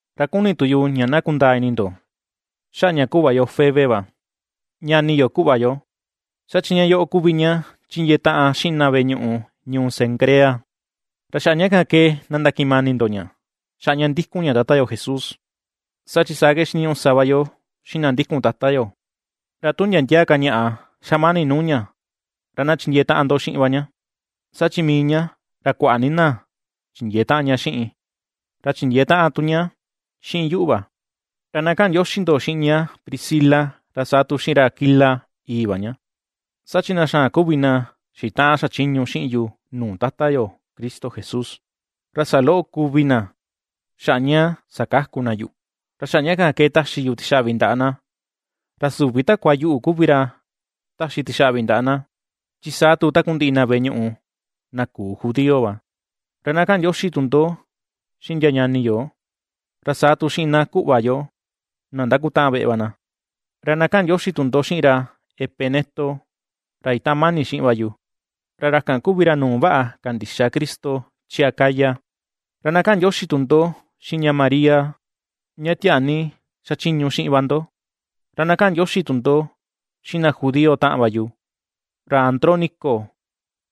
Ra kuni tu yu ña na kundaa ini ndo xaꞌa ña kuꞌva yo Febe va, ñani yo kuꞌva yo, saa chi ña yoꞌo kuvi ña chindiee taꞌan xiꞌin na veꞌe ñuꞌu ñuu Cencrea. Ra xaꞌa ña kan ke na ndakiꞌin mani ndo ña xaꞌa ña ndikun ña Tata yo Jesús, saa chi saa ke xiniñuꞌu sa va yo xiꞌin na ndikun Tata yo. Ra tu ndia ndia ka ñaꞌa xa mani nuu ña, ra na chindiee taꞌan ndo xiꞌin va ña, saa chi mii ña ra kuaꞌa ni na chindiee taꞌan ña xiꞌin, ra chindiee taꞌan tu ña xiꞌin yuꞌu va. Ra na kaꞌan ndioxi ndo xiꞌin ña Priscila, ra saa tu xiꞌin ra Aquila, ìi̱ va ña, saa chi na xaan kuvi na xitaꞌan xachiñu xiꞌin yu nuu Tata yo Cristo Jesús. Ra saloꞌo kuvi na, xaꞌa ña sakaku na yuꞌu, ra xaꞌa ña kan ke taxi yu tixaꞌvi ndaꞌa na. Ra süvi takua yuꞌu kuvi ra taxi tixaꞌvi ndaꞌa na, chi saa tu takundiꞌi na veꞌe ñuꞌu na küu judío va. Ra na kaꞌan ndioxi tu ndo xiꞌin ndia ñani yo, ra saa tu xiꞌin na kuꞌva yo, na ndakutaꞌan veꞌe va na. Ra na kaꞌan ndioxi tu ndo xiꞌin ra Epeneto, ra itaꞌan mani xiꞌin va yu, ra kan kuvi ra nuu vaꞌa kandixa Cristo chi Acaya. Ra na kaꞌan ndioxi tu ndo xiꞌin ña María, ña tiaa ni xachiñu xiꞌin va ndo. Ra na kaꞌan ndioxi tu ndo xiꞌin na judío taꞌan va yu, ra Andrónico,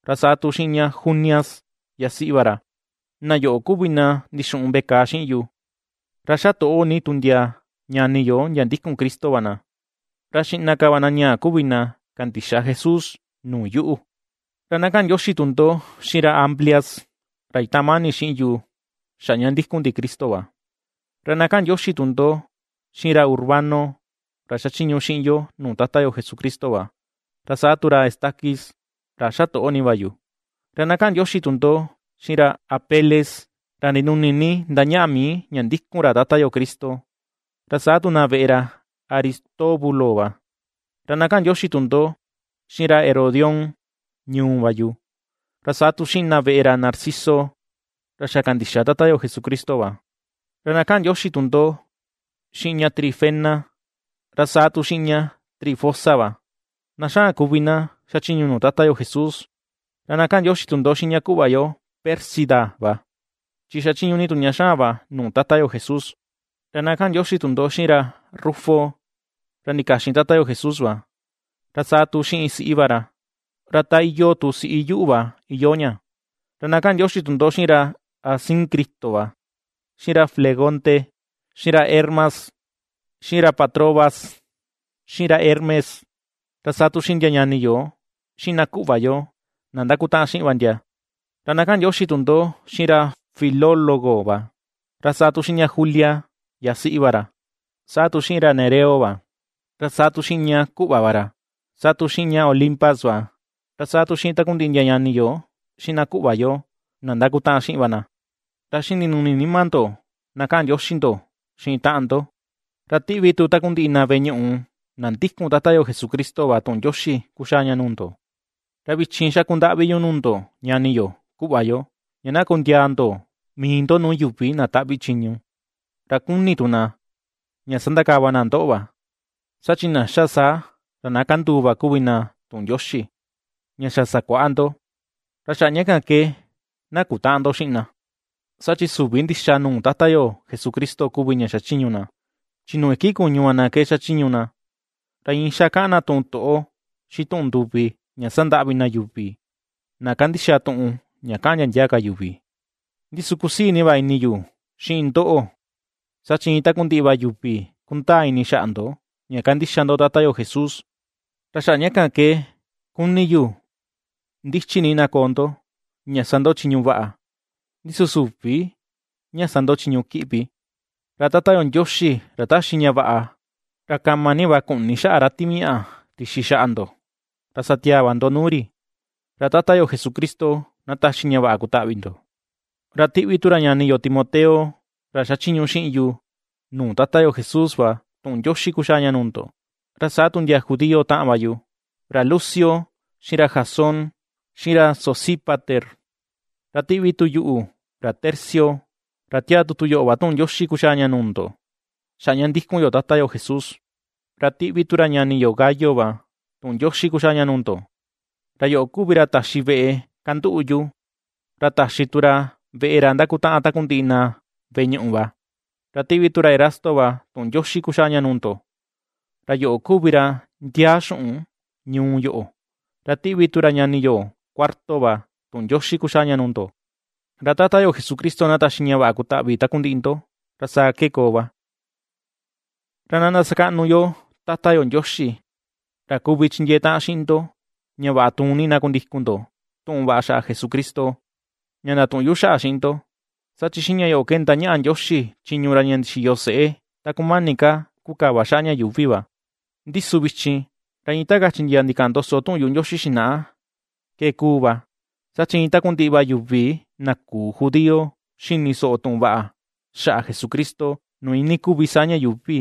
ra saa tu xiꞌin ña Junias, yasiꞌi va ra, na yoꞌo kuvi na ndixuꞌun veꞌe kàà xiꞌin yu, ra ^xa toꞌo ni tu ndia ñani yo ndia ndikun Cristo va na, ra xiꞌna ka va na ñaa kuvi na kandixa Jesús nuu yuꞌu. Ra na kaꞌan ndioxi tu ndo xiꞌin ra Amplias, ra itaꞌan mani xiꞌin yu xaꞌa ña ndikun ndi Cristo va. Ra na kaꞌan ndioxi tu ndo xiꞌin ra Urbano, ra xachiñu xiꞌin yo nuu Tata yo Jesucristo va, ra saa tu ra Estaquis, ra ^xa toꞌo ni va yu. Ra na kaꞌan ndioxi tu ndo xiꞌin ra Apeles, ra ndinuni ni ndañaꞌa mii ña ndikun ra Tata yo Cristo, ra saa tu na veꞌe ra Aristóbulo va. Ra na kaꞌan ndioxi tu ndo xiꞌin ra Herodión, ñuu va yu, ra saa tu xiꞌin na veꞌe ra Narciso, ra xa kandixa Tata yo Jesucristo va. Ra na kaꞌan ndioxi tu ndo xiꞌin ña Trifena, ra saa tu xiꞌin ña Trifosa va, na xaan kuvi na ^xachiñu nuu Tata yo Jesús; ra na kaꞌan ndioxi tu ndo xiꞌin ña kuꞌva yo Pérsida va, chi ^xachiñu ni tu ña xaan va nuu Tata yo Jesús. Ra na kaꞌan ndioxi tu ndo xiꞌin ra Rufo, ra ndikaxin Tata yo Jesús va, ra saa tu xiꞌin siꞌi va ra, ra ta iyoo tu siꞌi yuꞌu va iyoo ña. Ra na kaꞌan ndioxi tu ndo xiꞌin ra Asíncrito va, xiꞌin ra Flegonte, xiꞌin ra Hermas, xiꞌin ra Patrobas, xiꞌin ra Hermes, ra saa tu xiꞌin ndia ñani yo xiꞌin na kuꞌva yo na ndakutaꞌan xiꞌin va ndia. Ra na kaꞌan ndioxi tu ndo xiꞌin ra Filólogo va, ra saa tu xiꞌin ña Julia, yasiꞌi va ra, saa tu xiꞌin ra Nereo va, ra saa tu xiꞌin ña kuꞌva va ra, saa tu xiꞌin ña Olimpas va, ra saa tu xiꞌin takundiꞌi ndia ñani yo, xiꞌin na kuꞌva yo, na ndakutaꞌan xiꞌin va na. Ra xiꞌin ndinuni nima ndo, na kaꞌan ndioxi ndo xiꞌin taꞌan ndo. Ra tiꞌvi tu takundiꞌi na veꞌe ñuꞌu na ndikun Tata yo Jesucristo va tuꞌun ndioxi kuxaa nuu ndo. Ra vichin xaku ndaꞌvi yu nuu ndo ñani yo, kuꞌva yo, ña na kundiaa ndo mii ndo nuu yuvi na taꞌvi chiñu, ra kuni tu na ña sandakava na ndoꞌo va, saa chi na ^xa saa ra na kanduu va kuvi na tuꞌun Ndioxi, ña xa sakuaꞌa ndo. Ra xaꞌa ña kan ke na kutäꞌan ndo xiꞌin na, saa chi süvi ndixa nuu Tata yo Jesucristo kuvi ña xachiñu na, chi nuu iki kuñu va na ke xachiñu na, ra iin xa kaꞌan na tuꞌun toꞌo, xiꞌin tuꞌun nduvi ña sandaꞌvi na yuvi na kandixa tuꞌun ña kaꞌan ndia ndia ka yuvi. Ndi su kusii ni va ini yu xiꞌin ndoꞌo, saa chi iin takundiꞌi va yuvi kundaa ini xaꞌa ndo ña kandixa ndo Tata yo Jesús, ra xaꞌa ña kan ke ^kuni yu ndichi ni na koo ndo ña sa ndo chiñu vaꞌa, ndi su süvi ña sa ndo chiñu kiꞌvi. Ra Tata yo Ndioxi ra taxi ña vaꞌa, ra kama ni va ku̱ꞌni̱ xaꞌa ra Timiaꞌa tixi xaꞌa ndo, ra satiaa va ndo nuu ri. Ra Tata yo Jesucristo na taxi ña vaꞌa kutaꞌvi ndo. Ra tiꞌvi tu ra ñani yo Timoteo ra sachiñu xiꞌin yu nuu Tata yo Jesús va tuꞌun ndioxi kuxaa nuu ndo, ra saa tu ndia judío taꞌan va yu, ra Lucio, xiꞌin ra Jasón, xiꞌin ra Sosípater. Ra tiꞌvi tu yuꞌu, ra Tercio, ra tiaa tutu yoꞌo va tuꞌun ndioxi kuxaa ña nuu ndo, xaꞌa ña ndikun yo Tata yo Jesús. Ra tiꞌvi tu ra ñani yo Gayo va tuꞌun ndioxi kuxaa nuu ndo. Ra yoꞌo kuvi ra taxi veꞌe kanduꞌu yu, ra taxi tu ra veꞌe ra ndakutaꞌan takundiꞌi na veꞌe ñuꞌu va. Ra tiꞌvi tu ra Erasto va tuꞌun ndioxi kuxaa ña nuu ndo, ra yoꞌo kuvi ra ndiaa xuꞌun ñuu yoꞌo. Ra tiꞌvi tu ra ñani yo Cuarto va tuꞌun ndioxi kuxaa nuu ndo. Ra Tata yo Jesucristo na taxi ña vaꞌa kutaꞌvi takundiꞌi ndo. Ra saa ke koo va. Ra na ndasakaꞌnu yo Tata yo Ndioxi, ra kuvi chindiee taꞌan xiꞌin ndo ña vaꞌa tuun ni na kundikun ndo tuꞌun vaꞌa xaꞌa Jesucristo, ña ndatuꞌun yu xaꞌa xiꞌin ndo. Saa chi xiꞌin ña yoꞌo ke ndañaꞌa Ndioxi chiñu ra ña ndixiyo seꞌe ta kumani ka kukava xaꞌa ña yuuvi va, ndi su vichin, ra iin ta kachi ndia ndikaꞌan ndoso tuꞌun yuꞌu Ndioxi xinaꞌa ke ^kuu va, saa chi iin takundiꞌi va yuvi na küu judío ^xini soꞌo tuꞌun vaꞌa xaꞌa Jesucristo nuu iinii kuvi saa ña yuuvi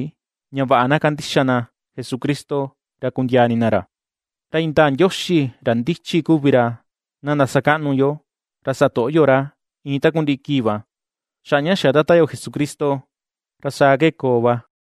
ña vaꞌa na kandixa na Jesucristo, ra kundiaa ini na ra. ¡Ra indaa Ndioxi ra ndichi kuvi ra; na ndasakaꞌnu yo, ra sa toꞌo yo ra iin takundiꞌi kii va, xaꞌa ña xa Tata yo Jesucristo! Ra saa ke koo va.